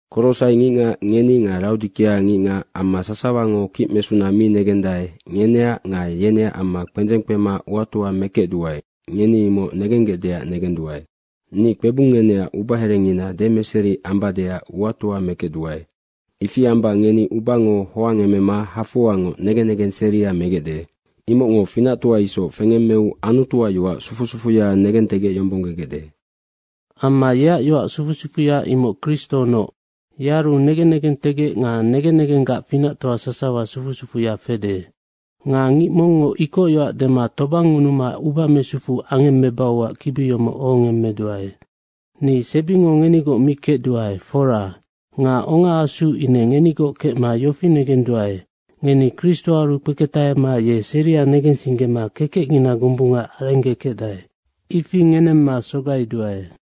Korosai ngicngac ngeni nga Raodikea ngicngac amma sasawango kicmesuna mi negendae, ngeneac nga yeneac amma kpendzeng kpema uatoa mekecduae, ngeni imoc negenggecdeac negenduae. Ni kpebung ngeneac ubaherengina demeseri ambadeac uatoa mekecduae. Ifi amba ngeni ubango hoangemema hafoangoc negen negeng seria megecde. Imocngo finactoa isoc fengemmeu Anutuac yoac sufu sufuya negentegecyombonggegecde. Amma yeac yoac sufu sufuya imoc Kristonoc. Yearunoc negen negentegec nga negen negenggac finactoa sasawa sufu sufuya fede. Nga ngic mongngo ikocyoac dema tobangngunuma uba mesufu angemmebauac kibi yomoc ohongemmeduae. Ni sebingo ngenigoc mi kecduae, fora. Nga ongaasuu ine ngenigoc kecma yofi negenduae, ngeni Kristoaru kpeketahema ye seria negensinggema kekecngina gombunga arenggekecdae. Ifi ngenemma sogaiduae.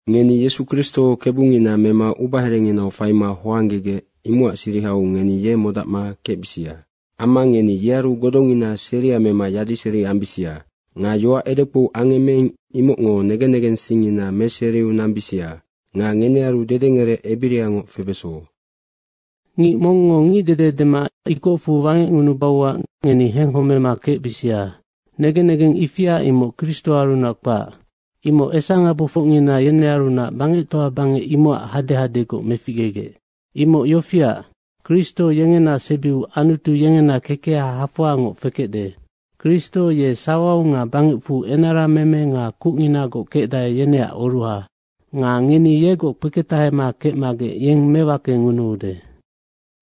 Ngeni Yesu Kristo Kebungina mema ubaherenginau faima hoanggegec, imocac sirihau ngeni ye modacma kecbisia. Amma ngeni yearu godongina seria mema yadiseri ambisia. Nga yoac edekpou angemmeing, imocngo negen negensingngina meseriu nambisia. Nga ngenearu dedengerec ebiriangoc febeso. Ngic mongngo ngicdede dema ikocfu wangecngunubauac ngeni henghomema kecbisia. Negen negeng ifia, imoc Kristoarunac kpac. Imoc esangabofocngina yenearunac bangectoa bangec, imocac hadehadegoc meficgegec. Imoc yofiac, Kristo yengena sebiu Anutu yengena kekeha hafoangoc fekecde. Kristo ye sawau nga bangecfu enarameme nga kucnginagoc kecdae, yeneac oruha. Nga ngeni yegoc kpeketahema kecmagec yeng mewakengunuude.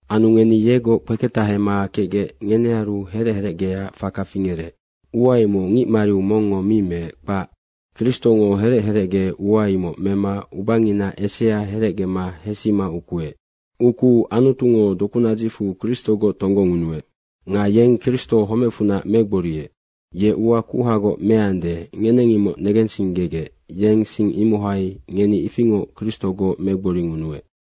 Anu ngeni yegoc kpeketahema kecgec ngenearu herec herecgeac faka fingerec. Ua imoc ngic mariu mongngo mi meec, kpac. Kristongo herec herecge ua imoc mema ubangina esea herecgema hesima ukuec. Ukuu Anutungo dokunadzicfu Kristogoc tonggongunuec. Nga Antungo Kristo homecfunac megboriec. Anutungo ua kuhagoc meande, ngeneng imoc negensinggegec yeng sing imohai ngeni ifingoc Kristogoc megboringunuec.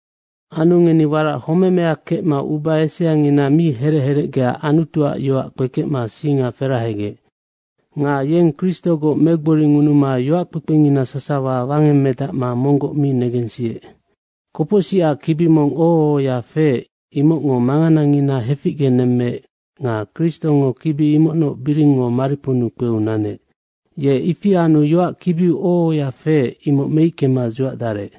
Anu ngeni warac homemea kecma uba eseangina mi herec herecgea Anutuac yoac kpekecma singa ferahegec. Nga yeng Kristogoc megboringunuma yoackpekpengina sasawa wangemmedacma monggoc mi negensiec. Kopocsicac kibi mong oho ohoya feec, imocngo manganangina heficgenemmeec nga Kristongo kibi imocnoc biringngo mariponnu kpeu nanec. Ye ifi anu yoac kibiu oho ohoya feec, imoc meickema dzuacdarec.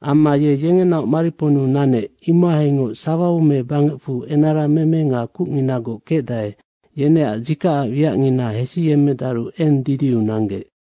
Amma ye yengenaoc mariponnu nanec, imohaingoc sawau me bangecfu enarameme nga kucnginagoc kecdae, yeneac dzikacac wiacngina hesiyemmedaru eng didiu nanggec.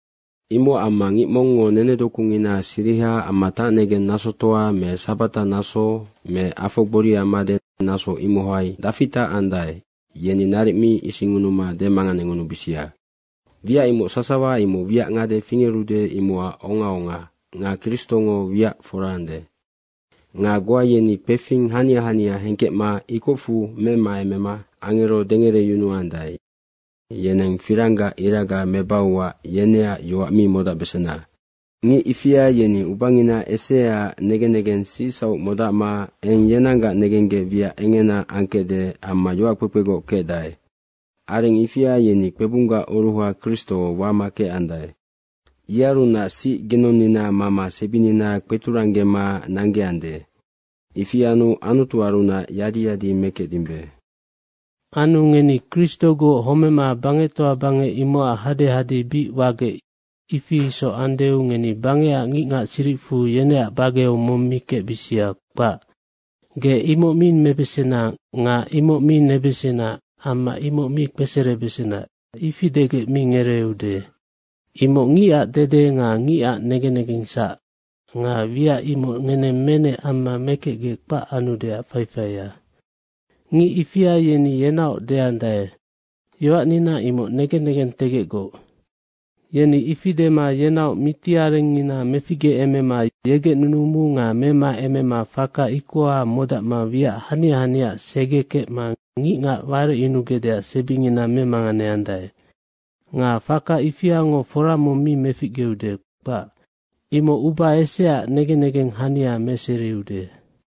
Imocac amma ngic mongngo nenedokungina siriha amma tacnegeng nasotoa me sabatanaso me afo gboria made, naso imohai dafi tacandae, yeni naric mi isingngunuma demanganengunubisia. Wiac imoc sasawa, imoc wiac ngade fingerude, imocac ongaonga nga Kristongo wiac fora ande. Nga goa yeni kpefing hania hania hengkecma ikocfu memaemema angero dengereyunuandae, yeneng firanggac iraga mebauac yeneac yoac mi modacbesena. Ngic ifia yeni ubangina eseaac negen negeng sicsauc modacma eng yenanggac negenggec wiac engena angkecde amma yoackpekpegoc kecdae. Areng ifia yeni kpebunggac oruha Kristo wama kecandae. Yearunac sic ginonnina mama sebinina kpeturanggema nanggeande. Ifi anu Anutuarunac yadi yadi mekecdimbe. Anu ngeni Kristogoc homema bangectoa bangec imocac hadehade bic wagec ifi isoc andeu, ngeni bangecac ngicngac siricfu yeneac bageu mong mi kecbisia, kpac. Ge imoc mi mebesena nga imoc mi nebesena amma imoc mi kpeserebesena, ifi degec mi ngereeude. Imoc ngicac dede nga ngicac negen negengsac nga wiac imoc ngeneng menec amma mekecgec kpac anudeac faifaia. Anu ngic ifia yeni yenaoc deandae, “Yoacnina imoc negen negentegecgoc.” Yeni ifi dema yenaoc miti arengngina meficgeemema yegec nunumu nga memaemema faka ikoha modacma wiac hania haniaac segekecma ngicngac warecyunugecdeac sebingina memanganeandae. Nga faka ifiango fora mong mi meficgeude, kpac. Imoc uba eseaac negen negeng hania meseriude.